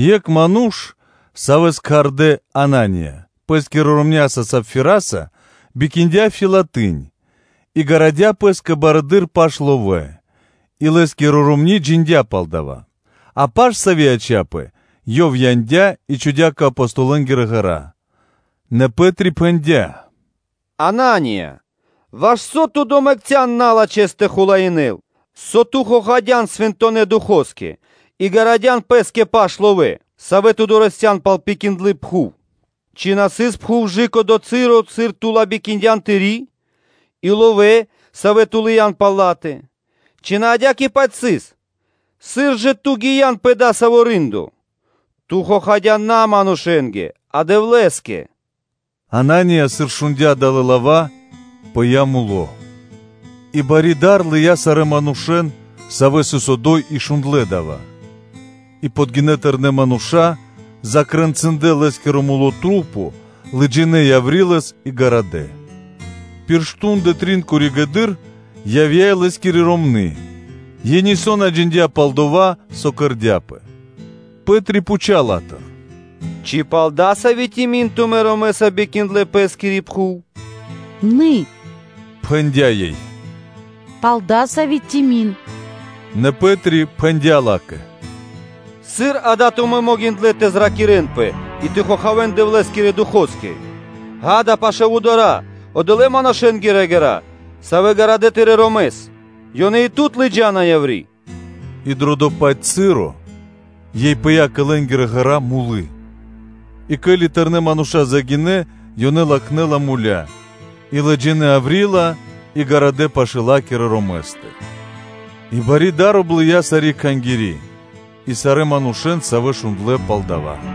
Екх ману́ш, савэ́с кхардэ́ Анания, пэ́скирэ ромня́са Сапфираса, бикиндя фэлатин, и ґарадя пэ́скэ барэды́р паш ловэ́, и лэ́скири ромны́ джиндя́ пал дава́, а паш, сави́ яця́пэ, ёв яндя́ и чхудя́ кэ Апостолэнгирэ ґэра́. Нэ Пэ́три пхэндя́: “Анание! Ваш со ту домэкцян налачхэ́с тэ хулаинэ́л, со ту хохадян Свэнтонэ́ Духоскэ и ґарадян пэ́скэ паш ловэ́, савэ́ ту дорэсцян пал бикиндлы пхув? Ци на сыс пхув кэ дова́ часо, сыр ту ла бикиндян, тыри́, и ловэ́, савэ́ ту лыян пал ла́тэ, ци на адя́кэ-паць сыс тырэ́, сыр жа ту ги́ян пэ дасаво рэ́ндо? Ту хохадян на манушэ́нгэ, а Дэвлэ́скэ!” Ананиё, сыр шундя́ далэ́ лава́, пыя́ муло́; и бари дар лыя́ сарэ́н манушэ́н, савэ́ сыс одо́й и шундлэ́ дава́. И подгинэ́ тэрнэ́ мануша́, закрэнцындлэ лэ́скиро тру́по, лыджинэ́ яври́ лэс и ґарадэ́. Пир мардэ́ (штунды) трин коригэды́р (позжэды́р) явдя́ и лэ́скири ромны́, ёй нисо́ на джиндя́ пал дова́, со кэрдя́пэ. Пэ́три пхуця́ ла́тыр: “Ци пал дасави́ тими́н тумэ́ ромэса бикиндлэ пэ́скири пхув?” “Адя́кэ, – пхэндя́ ёй, – пал дасави́ тими́н.” Нэ Пэ́три пхэндя́ ла́кэ: “Сыр да тумэ́ могиндлэ́ тэ зракирэнпэ и тэ хохавэн Дэвлэ́скирэ Духоскэ? Ѓа́да, пашы́л вудара́ исын ґэра́ одолэ́-манушэ́нгирэ ґэра́, савэ́ ґарадэ́ тырэ́ ромэс: ёнэ и тут лыджа́на яври́.” И дро дова́-паць часо ёй пыя́ мулы кэ лэ́нгирэ ґэра́. И ке́ли тэрнэ́ мануша́ загинэ́, ёнэ латхнэ́ ла муля, и лыджинэ́ яври́ ла, и ґарадэ́ пашы́л ла́кирэ ромэстэ. И бари дар облыя сари́ Кхангири́ и сарэ́ манушэ́н, савэ́ шундлэ́ пал дава́.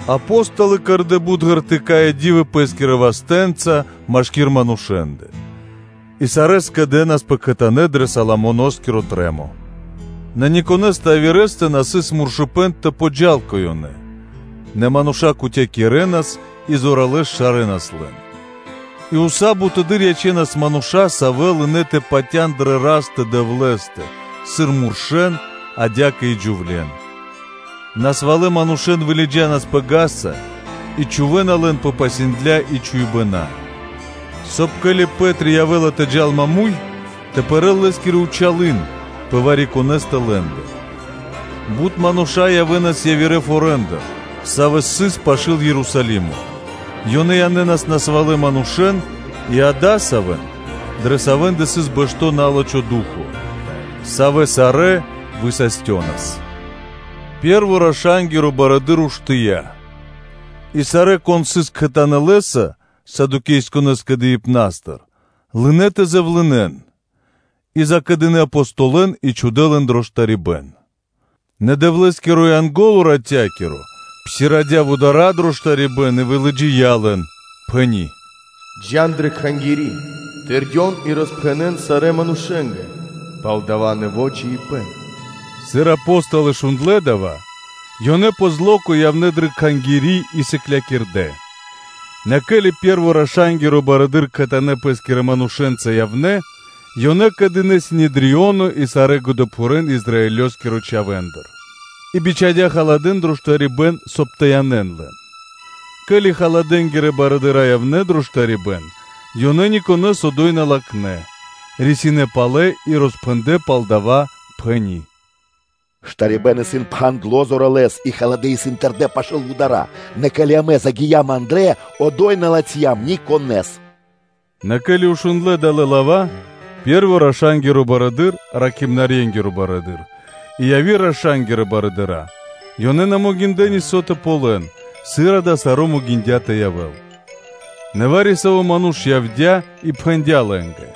Апо́столы кэрдэ́ бут знаме́нии (ґертыка́) и ди́вы пэ́скирэ вастэ́нца машки́р манушэ́ндэ; и сарэ́ скэдэнаспэ кхэтанэ́ дро Соломоно́скиро трэ́мо, нэ никонэстэ явирэ́стэ на сыс муршыпэн тэ подджа́л кэ ёнэ, нэ мануша́ кутякирэнас и барьякирэнас паты́в лэ́нгэ; и уса́ буты́р ячэнас мануша́, савэ́ лынэ́ тэ патя́н дрэ Растэ-Дэвлэ́стэ сыр муршэ́н, адя́кэ и джувле́н, сыр мануша́ вылыджанас насвалэн пэ вули́ца (га́са) и чхувэ́нас лэн пэ пасиндля (постели) и чхуибэна, соб (кай) ке́ли Пэ́три явэ́ла тэ джал маму́й, тэ пэрэ́л Лэ́скири зэр (тенё) пэ вари-конэ́стэ лэ́ндыр. Бут мануша́ явэ́нас явирэ форье́ндыр, савэ́ сыс пашы́л Ерусалимо, ёнэ янэ́нас насвалэ манушэ́н и адасавэн, дрэ савэ́ндэ сыс бэшто́ на́лачхо ду́хо (фа́но), савэ́ сарэ́ высастёнас. Пэ́рво раша́нгиро барыдыро́ уштыя́, и сарэ́, кон сыс кхэтанэ́ лэ́са Садукеенгирэ скэдыибна́стыр лынэ́ тэ зэвлынэн, и закэдынэ Апостолэн, и чхудэ́ лэн дро штарибэ́н. Нэ Дэвлэ́скиро Янго́ло ратя́киро псирадя вудара́ дро штарибэ́н и вылыджия́ лэн, пхэни́: “Джа́н дрэ Кхангири́, тэрдён и роспхэнэ́н сарэ́ манушэ́нгэ пал дава́ нэво́ джиибэ́н.” Сыр Апо́столы шундлэ́ дава́, ёнэ пэ зло́ко (ра́нко) явнэ́ дрэ Кхангири́ и сыклякирдэ́. Нэ, ке́ли пэ́рво раша́нгиро барыдыро́ кхэтанэ́ пэ́скирэ манушэ́нца явнэ́, ёнэ кэдынэ Синедрионо и сарэ́ годэпхурэн Израилёскирэ чхавэ́ндыр и бичхадя́ халадэ́н дро штарибэ́н, соб (кай) тэ янэ́н лэн. Ке́ли халадэ́нгирэ барыдыра́ явнэ́ дро штарибэ́н, ёнэ никонэ́с одо́й на латхнэ́, рисинэ́ палэ и роспхэндлэ́ пал дава́, пхэни́: “Штарибэ́н исын пхандло зоралэ́с, и ракхибна́рья исын тэрдэ́ пашы́л вудара́, нэ, ке́ли амэ загиям андрэ́, одо́й на латхям никонэ́с. Нэ ке́ли шундлэ́ далэ́ лава́, – пэ́рво раша́нгиро барыдыро́, ракхибнарьенгиро барыдыро́ и яви́р раша́нгирэ барыдыра́, ёнэ на могиндлэ́ нисо́ тэ ґалён, сыр дава́ саро́ могиндя́ тэ явэ́л? Нэ вари-саво́ ману́ш явдя́ и пхэндя́ лэ́нгэ: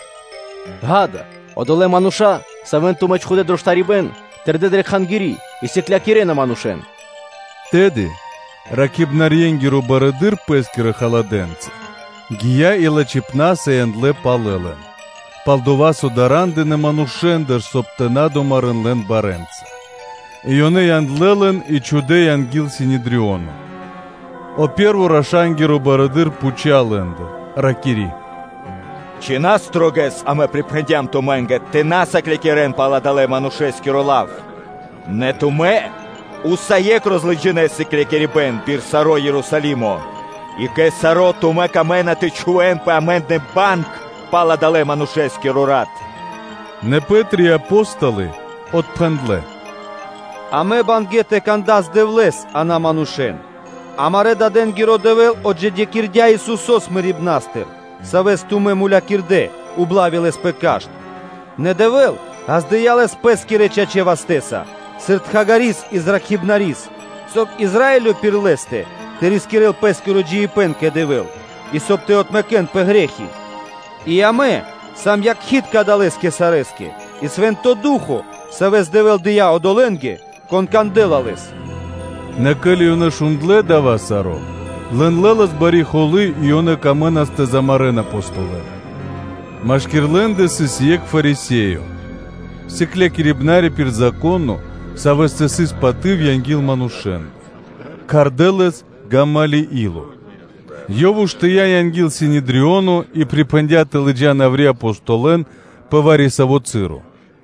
“Ѓа́да, одолэ́ мануша́, савэ́н тумэ́ чхудэ́ дро штарибэ́н, исын тэрдэ́ дрэ Кхангири́ и сыклякирэ́на манушэ́н.” Тэды ракхибнарье́нгиро барыдыро́ пэ́скирэ халадэнца гия́ и лачхипна́са яндлэ́ палэ лэн, пал-дова́ со дара́ндынэ манушэ́ндыр, соб (кай) тэ на домарэн лэн барэ́нца. И ёнэ яндлэ́ лэн и чхудэ́ анги́л Синедрионо. О пэ́рво раша́нгиро барыдыро́ пхуця́ лэ́ндыр, ракири́: “Ци на шылалэс амэ припхэндям тумэ́нгэ тэ на сыклякирэ́н пал Адалэ́-Манушэ́скиро лав? Нэ тумэ́ усае́кх розлыджинэ сыклякирибэ́н пир саро́ Ерусалимо, и кэ саро́ тумэ́ камэ́на тэ чхувэ́н пэ амэ́ндэ банг пал Адалэ́-Манушэ́скиро рат.” Нэ Пэ́три и Апо́столы отпхэндлэ́: “Амэ сам бангэ́ (мусинаса) тэ кандас Дэвлэ́с, а на манушэ́н. Амарэ́-дадэ́нгиро Дэвэ́л отджидякирдя́ Исусо́с мэрибна́стыр, савэ́с тумэ́ мулякирдэ́, ублави Лэс пэ кашт. Нэ Дэвэ́л ґаздыя́ Лэс Пэ́скирэ чачэ́ вастэ́са, сыр Шэрэ Рас и Зракхибнарис, соб (кай) Израилё пир Лэ́стэ тэ рискирэ́л пэ́скиро джиибэ́н кэ Дэвэ́л, и соб (кай) тэ отмэкэнпэ грэ́хи. И амэ сам якхи́тка далэскэ сарэскэ и Свэ́нто Ду́хо (Фа́но), Савэс Дэвэ́л дыя́ одолэ́нгэ, кон кандэ́ла Лэс.” Нэ ке́ли ёнэ шундлэ́ дава́ саро́, лэн лэлас бари холы́ и ёнэ камэнас тэ замарэ́н Апостолэн. Машкир лэ́ндэ сыс екх Фарисеё, сыклякирибнари пир Зако́но, савэ́стэ сыс паты́в анги́л манушэ́ндэ, кхардэ́ лэс Гамалиило’, ёв уштыя́ анги́л Синедрионо и припхэндя́ тэ лыджа́н яври́ Апостолэн пэ вари-саво́ часо,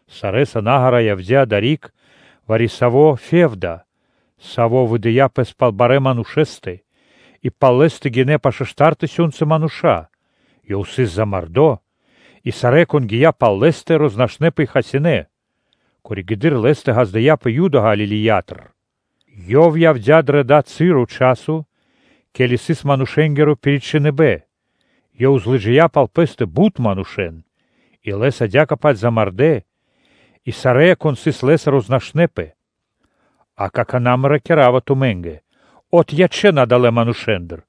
сарэ́са наґара явдя́ адари́к вари-саво́ Февда, саво́ выдыя пэс пал барэ́ манушэ́стэ, и пал лэ́стэ гинэ́ пашэ́ штар шэла́ тысёнцы мануша́; ёв сыс замардо, и сарэ́, кон гия́ пал лэ́стэ, рознашнэпэ и хасинэ́. Пало́ (после) лэ́стэ ґаздыя́пэ Юда Галилеятыр, ёв явдя́ дрэ дава́ часо, ке́ли сыс манушэ́нгиро пиричхиныбэн, ёв злыджия пал пэ́стэ бут манушэ́н, и лэс адя́кэ-паць замардэ́ и сарэ́, кон сыс лэ́са, рознашнэпэ. А какана́ мэ ракира́ва тумэ́нгэ: отячэн адалэ́ манушэ́ндыр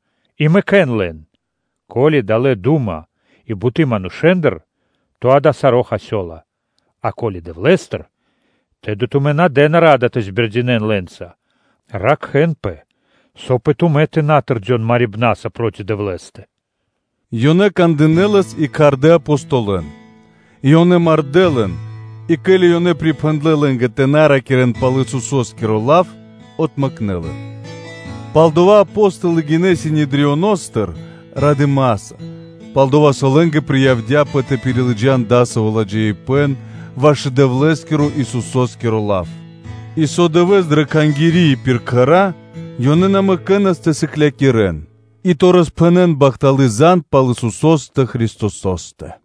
и мэкэ́н лэн; ко́ли далэ́ ду́мы и буты́ манушэ́ндыр, то дава́ саро́ хасёла; а ко́ли Дэвлэ́стыр, тэды тумэ́ на дэ́на ра́да тэ пиризорьякирэн лэн; ракхэ́нпэ, соб (кай) и тумэ́ тэ на тэрдён марибна́са проти Дэвлэ́стэ.” Ёнэ кандынэ́ лэс и кхардэ́ Апостолэн, и ёнэ мардэ́ лэн; и ке́ли ёнэ припхэндлэ лэ́нгэ тэ на ракирэ́н пал Исусо́скиро лав, отмэкнэ лэн. Палдава́ Апо́столы гинэ́ Синедрионостыр радыма́са, пал-дова́ со лэ́нгэ приявдяпэ тэ пирилыджан дасаво ладжаипэ́н ваш Дэвлэ́скирэ-Исусо́скиро лав. И со дывэ́с дрэ Кхангири́ и пир кхэра́, ёнэ на мэкэнас тэ сыклякирэ́н и тэ роспхэнэ́н бахтало́ лав пал Исусо́стэ Христосо́стэ.